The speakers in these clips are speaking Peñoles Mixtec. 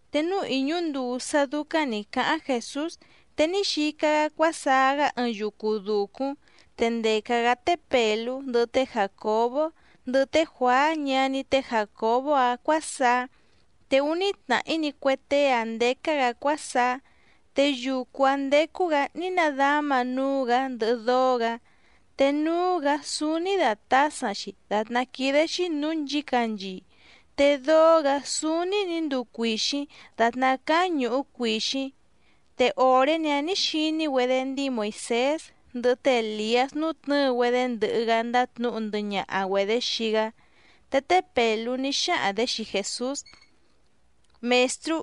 Te núú ìñú nduu sá dúcáⁿ nǐ cáháⁿ Jèsús, te ní xica‑gá cuásaá‑gá ɨɨⁿ yucu dùcúⁿ, te ndèca‑gá té Pèlú, ndɨhɨ té Jàcobó, ndɨhɨ té Juàá ñaní té Jàcobó‑áⁿ cuǎsaá. Te úní tnàhí‑ni cue tée‑áⁿ ndécá‑gǎ cuásaá. Te yucu‑áⁿ ndécú‑gǎ ní nadáma núú‑gǎ ndɨhɨ dóó‑gǎ, te núú‑gǎ súúní dàtásaⁿ‑xi dàtná quídé‑xí nǔú nchǐcanchii, te dóó‑gǎ súúní nǐ nduu cuìxíⁿ dàtná cáá ñùhú cuìxíⁿ. Te òré‑ni‑áⁿ nǐ xiní‑güedé ndíi Moìsés ndɨhɨ té Èliás nútnɨ̌ɨ‑güedé ndɨhɨ‑gá ndátnǔhu ndɨhɨ ñaha‑güedě xii‑gá. Te té Pèlú ní xáhaⁿ‑dě xii Jèsús: —Mèstrú,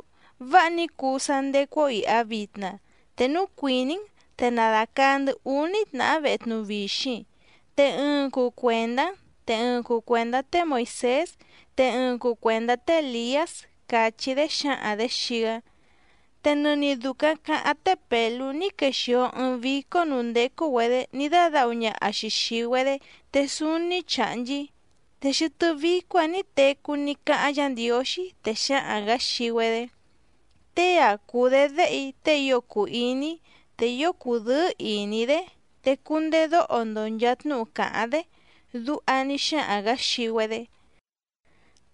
¡váha ní cuu sá ndécú‑ó ìha vitna! Te núu cuìní‑n, te na dàcaa‑ndɨ́ úní tnàhá vehe tnuvixiⁿ, te ɨɨⁿ cuu cuèndá‑n, te ɨɨⁿ cuu cuèndá té Moìsés, te ɨɨⁿ cuu cuèndá té Èliás —càchí‑dé xǎhaⁿ‑dě xii‑gá. Te nɨni dùcaⁿ caháⁿ té Pèlú ní quexìo ɨɨⁿ vícó nǔú ndécú‑güedě ní dádǎhu ñaha‑xi xìi‑güedé te súúní chàhnchí. Te xɨtɨ́ vícó‑ǎⁿ nǐ tecú ní cáháⁿ Yǎ Ndiǒxí, te xǎhaⁿ‑gǎ xii‑güedé: —Tée‑a cùu‑dé Déhe‑í tée ío cùu iní‑í, te ío cùdɨ́ɨ́ ìní‑í‑dé, te cundedóho‑ndo nchàa tnúhu càháⁿ‑dé —duha ní xáhaⁿ‑gǎ xii‑güedé.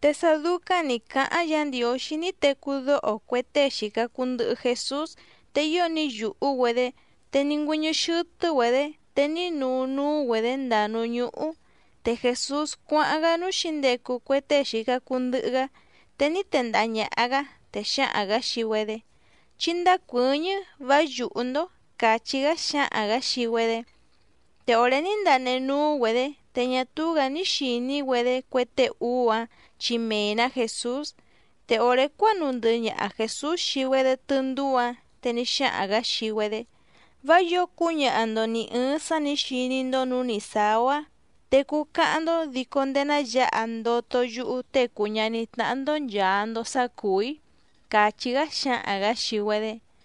Te sá dúcáⁿ nǐ cáháⁿ Yǎ Ndiǒxí ní tecú dóho cue tée xìca cuu ndɨhɨ Jesús te ío ní yùhú‑güedé, te ní ngüɨ́ñɨ́ xɨ́tɨ́‑güedě te ní nuu núú‑güedě ndàa núú ñúhú. Te Jèsús cuáháⁿ‑gá núú xǐndecu cue tée xìca cuu ndɨhɨ‑gá, te ní tendaha ñàha‑gá, te xǎhaⁿ‑gǎ xii‑güedé: —Chí ndácuɨ̌ñɨ́, vá yùhú‑ndó —càchí‑gá xǎhaⁿ‑gǎ xii‑güedé. Te òré ní ndanehe núú‑güedě, te ñá túú‑gǎ ní xìní‑güedé cue tée úú‑áⁿ chi mee‑nǎ Jèsús. Te òré cuánuu ndɨhɨ ñaha Jèsús xii‑güedé tɨndúú‑ǎⁿ, te ní xáhaⁿ‑gǎ xii‑güedé: —Vá yǒo cúñaha‑ndo nì ɨɨⁿ sá nǐ xiní‑ndó nǔú nì sáá‑ó‑á, te cuu cáháⁿ‑ndó dico ndéé ná yǎha ndoto yúhú Tée cùu ñaní tnáhá‑ndó nchàa‑ndo sá cùú‑í —càchí‑gá xǎhaⁿ‑gǎ xii‑güedé.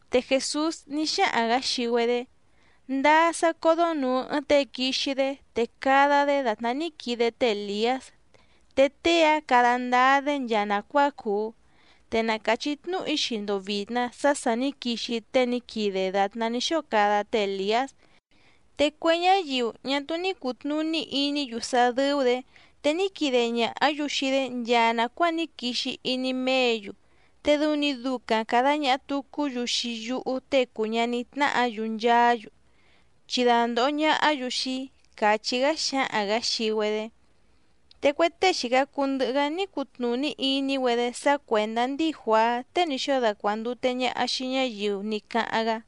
Te Jèsús ní xáhaⁿ‑gǎ xii‑güedé: —Ndáá sá códó nùu ɨɨⁿ tée quixi‑dé te cada‑dé dàtná ní quide té Èliás te tée‑áⁿ cada ndáá‑dé nchaa nàcuáa cùu. Te na càchí tnúhu‑í xii‑ndo vìtna sá sà ní quixi tée ní quide dàtná ní xóo cada té Èliás, te cue ñáyiu ñá túú ní cùtnuní iní‑yu sá dɨ́ú‑dě, te ní quide ñàhá‑yu xii‑dé nchaa nàcuáa ní quixi iní méě‑yu, te dɨu‑ni ducaⁿ càda ñaha tucú‑yu xii yúhú Tée cùu ñaní tnáhǎ‑yu nchaá‑yu, chi dandòho ñahá‑yu xii‑í —càchí‑gá xǎhaⁿ‑gǎ xii‑güedé. Te cue tée xìca cuu ndɨhɨ‑gá ní cutnùní iní‑güedé sá cuèndá ndíi Juàá tée ní xóo dacuàndute ñaha xii ñáyiu ní cáháⁿ‑gá.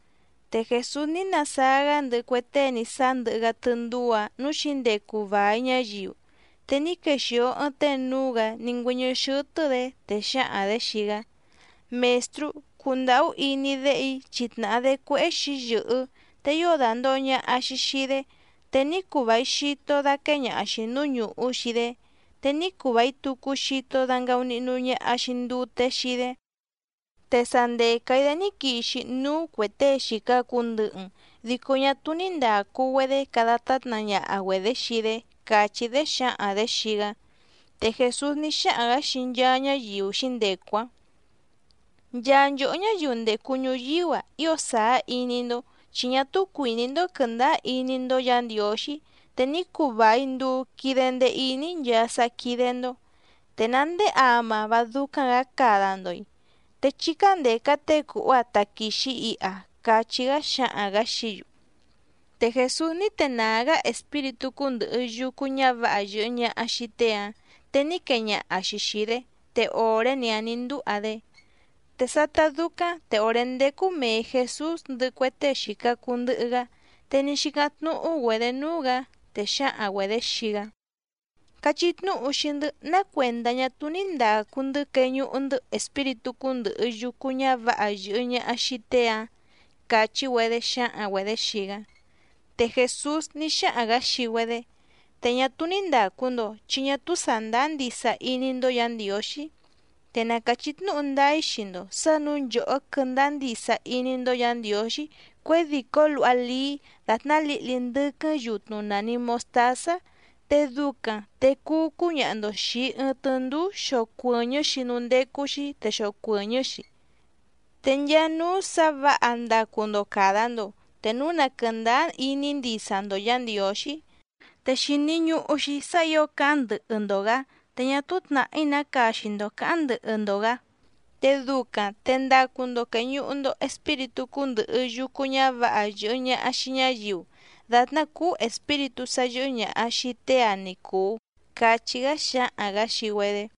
Te Jèsús ní nasáá‑gá ndɨhɨ cue tée ní sáá ndɨhɨ‑gá tɨndúú‑ǎⁿ núú xǐndecu vài ñáyiu, te ní quexìo ɨɨⁿ tée núú‑gǎ ní ngüɨ́ñɨ́ xɨ́tɨ́‑dě, te xǎhaⁿ‑dě xii‑gá: —Mèstrú, cundàhú iní déhe‑í chi tnàhá‑dé cuéhé xǐyɨ̀hɨ́, te ío dàndoho ñaha‑xi xii‑dé, te ní cuu vài xito daquée ñaha‑xi nǔú ñùhú xii‑dé, te ní cuu vài tucu xito dangaunihnu ñaha‑xi ndute xii‑dé. Te sa ndèca‑í‑dé ní quixi núú cuè tée xìca cuu ndɨhɨ‑n dico ñá túú ní ndàcu‑güedé cada tátna ñaha‑güedě xii‑dé —càchí‑dé xǎhaⁿ‑dě xii‑gá. Te Jèsús ní xáhaⁿ‑gǎ xii nchaa ñáyiu xǐndecu‑áⁿ: —Nchaa nchòhó ñáyiu ndècu ñuyíú‑a, ío sàá iní‑ndó chi ñá túú cuìní‑ndó quɨ̀ndáá iní‑ndó Yǎ Ndiǒxí, te ní cuu vài nduu quide ndee iní‑í nchaa sá quídé‑ndó. ¿Te ná ndéé ama vá dúcáⁿ‑gǎ cada‑ndo‑i? Te chí cándèca tée cùhú‑áⁿ táquìxi iha —cachí‑gá xǎhaⁿ‑gǎ xií‑yu. Te Jèsús ní tenàá‑gá espíritú cúndɨ̀hɨ yucu ñávǎha yɨ̀hɨ ñaha xii tée‑áⁿ, te ní quee ñaha‑xi xìi‑dé, te òré‑ni‑áⁿ nǐ ndúha‑dé. Te sátá dúcáⁿ te òré ndécú mèe Jesús ndɨhɨ cue tée xìca cuu ndɨhɨ‑gá, te ní xícáⁿ tnúhú‑güedě núú‑gǎ, te xǎhaⁿ‑güedě xii‑gá: —Cachí tnúhu xii‑ndɨ́ ná cuèndá ñá túú ní ndàcu‑ndɨ́ queñuhu‑ndɨ́ espíritú cúndɨ̀hɨ yucu ñávǎha yɨ̀hɨ ñaha xii tée‑ǎⁿ —càchí‑güedé xǎhaⁿ‑güedě xii‑gá. Te Jèsús ní xáhaⁿ‑gǎ xii‑güedé: —Te ñá túú ní ndàcu‑ndo, chi ñá túú sàndáá ndisa iní‑ndó Yǎ Ndiǒxí. Te na càchí tnúhu ndáá‑í xii‑ndo sǎ nǔu nchòhó quɨ́ndáá ndisa iní‑ndó Yǎ Ndiǒxí cuědìcó luha lií dàtná lǐhli ndɨ́quɨ́ⁿ yutnu nàni mostázá, te ducaⁿ te cuu cúñaha‑ndo xìi ɨɨⁿ tɨndúú xocuɨ̀ñɨ́‑xi núú ndécú‑xí te xocuɨ̀ñɨ́‑xi. Te nchaa núú sǎ vǎha ndacu‑ndo càda‑ndo te núu na quɨ̀ndáá iní ndisa‑ndo Yǎ Ndiǒxí. Te xìni ñuhu‑xi sá ǐo cáháⁿ ndɨhɨ‑ndo‑gǎ te ñá túú tnàhí ná caxi‑ndo cǎháⁿ ndɨhɨ‑ndo‑gǎ, te ducaⁿ te ndacu‑ndo quèñuhu‑ndo espíritú cúndɨ̀hɨ yucu ñávǎha yɨ̀hɨ ñaha xii ñáyiu, dàtná cúú espíritú sá yɨ́hɨ́ ñàha xii tée‑ǎⁿ ní cùu —cachí‑gá xǎhaⁿ‑gǎ xii‑güedé.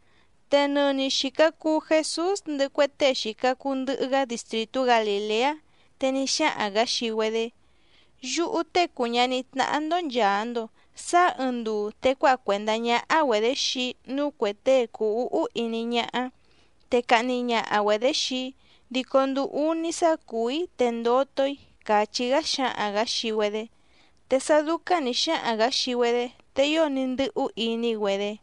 Te nɨni xìca cuu Jesús ndɨhɨ cue tée xìca cuu ndɨhɨ‑gá distrìtú Galìleá, te ní xáhaⁿ‑gǎ xii‑güedé: —Yúhú Tée cùu ñaní tnáhá‑ndó nchàa‑ndo sáá ɨɨⁿ nduu te cuáha cuèndá ñáhá‑güedě xii‑í núú cuè tée cùu úhú iní ñáhá, te cahni ñaha‑güedě xii‑í dico nduu úní sá cùú‑í te ndoto‑í —càchí‑gá xǎhaⁿ‑gǎ xii‑güedé. Te sá dúcáⁿ nǐ xáhaⁿ‑gǎ xii‑güedé, te ío ní ndɨ́hú iní‑güedé.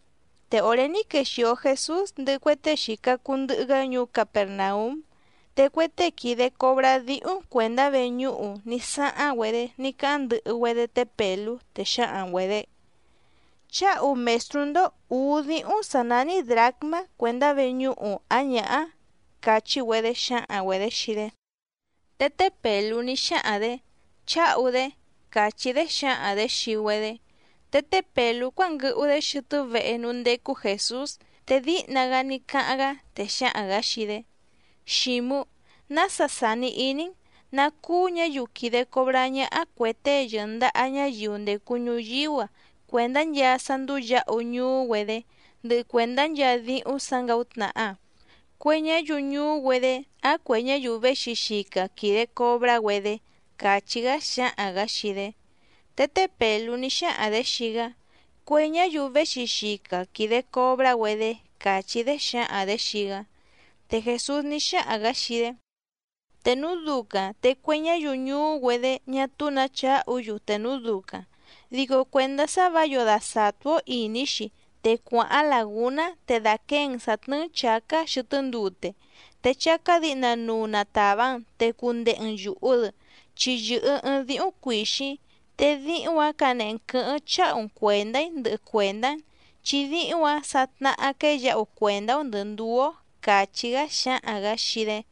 Te òré ní quexìo Jesús ndɨhɨ cue tée xìca cuu ndɨhɨ‑gá ñuú Capèrnaúm, te cue tée quìde cobrá díhúⁿ cuèndá veñúhu ní sáháⁿ‑güedé ní cáháⁿ ndɨhɨ‑güedé té Pèlú, te xǎhaⁿ‑güedě: —¿Chǎhu mèstrú‑ndó ǔú díhúⁿ sǎ nání drǎcmá cuèndá veñúhu ǎⁿ ñǎhá? —càchí‑güedé xǎhaⁿ‑güedě xii‑dé. Te té Pèlú ní xáhaⁿ‑dě: —Chǎhu‑dé —càchí‑dé xǎhaⁿ‑dě xii‑güedé. Te té Pèlú cuánguɨhu‑dé xɨtɨ́ vehe núú ndécú Jèsús, te díhna‑gá ní cáháⁿ‑gá, te xǎhaⁿ‑gǎ xii‑dé: —Xǐmú, ¿nása sàni iní‑n, ná cúú ñǎyiu quìde cobrá ñáhá cuè tée yɨ̀ndaha ñáyiu ndècu ñuyíú‑a cuèndá nchaa sá ndúú yǎhu ñuú‑güedé ndɨhɨ cuèndá nchaa díhúⁿ sǎ ngàútnàha, cue ñáyiu ñuú‑güedé ǎⁿ cuè ñáyiu véxi xica quìde cobrá‑güedé? —càchí‑gá xǎhaⁿ‑gǎ xii‑dé. Te té Pèlú ní xáhaⁿ‑dě xii‑gá: —Cue ñáyiu véxi xica quìde cobrá‑güedé —càchí‑dé xǎhaⁿ‑dě xii‑gá. Te Jèsús ní xáhaⁿ‑gǎ xii‑dé: —Te núu ducaⁿ te cue ñáyiu ñuú‑güedé ñá túú nǎ chǎhu‑yu te núu ducaⁿ. Dico cuèndá sá vǎ yǒo dasàtú‑ó ìní‑xi, te cuàháⁿ làgúná te dàquée‑n sǎ tnɨ́ɨ́‑n chǎcá xɨtɨ́ ndute, te chácá dǐhnanuu na tàva‑n te cundehe‑n yùhu‑dɨ, chi yɨ̀hɨ ɨɨⁿ díhúⁿ cuìxíⁿ. Te díhúⁿ‑ǎⁿ canehe‑n quɨ̌hɨ́ⁿ cháhu‑n cuèndá‑í ndɨhɨ cuèndá‑n, chi díhúⁿ‑ǎⁿ sa tnahá quéyǎhu cuèndá‑ó ndɨ̀ ndúú‑ó —càchí‑gá xǎhaⁿ‑gǎ xii‑dé.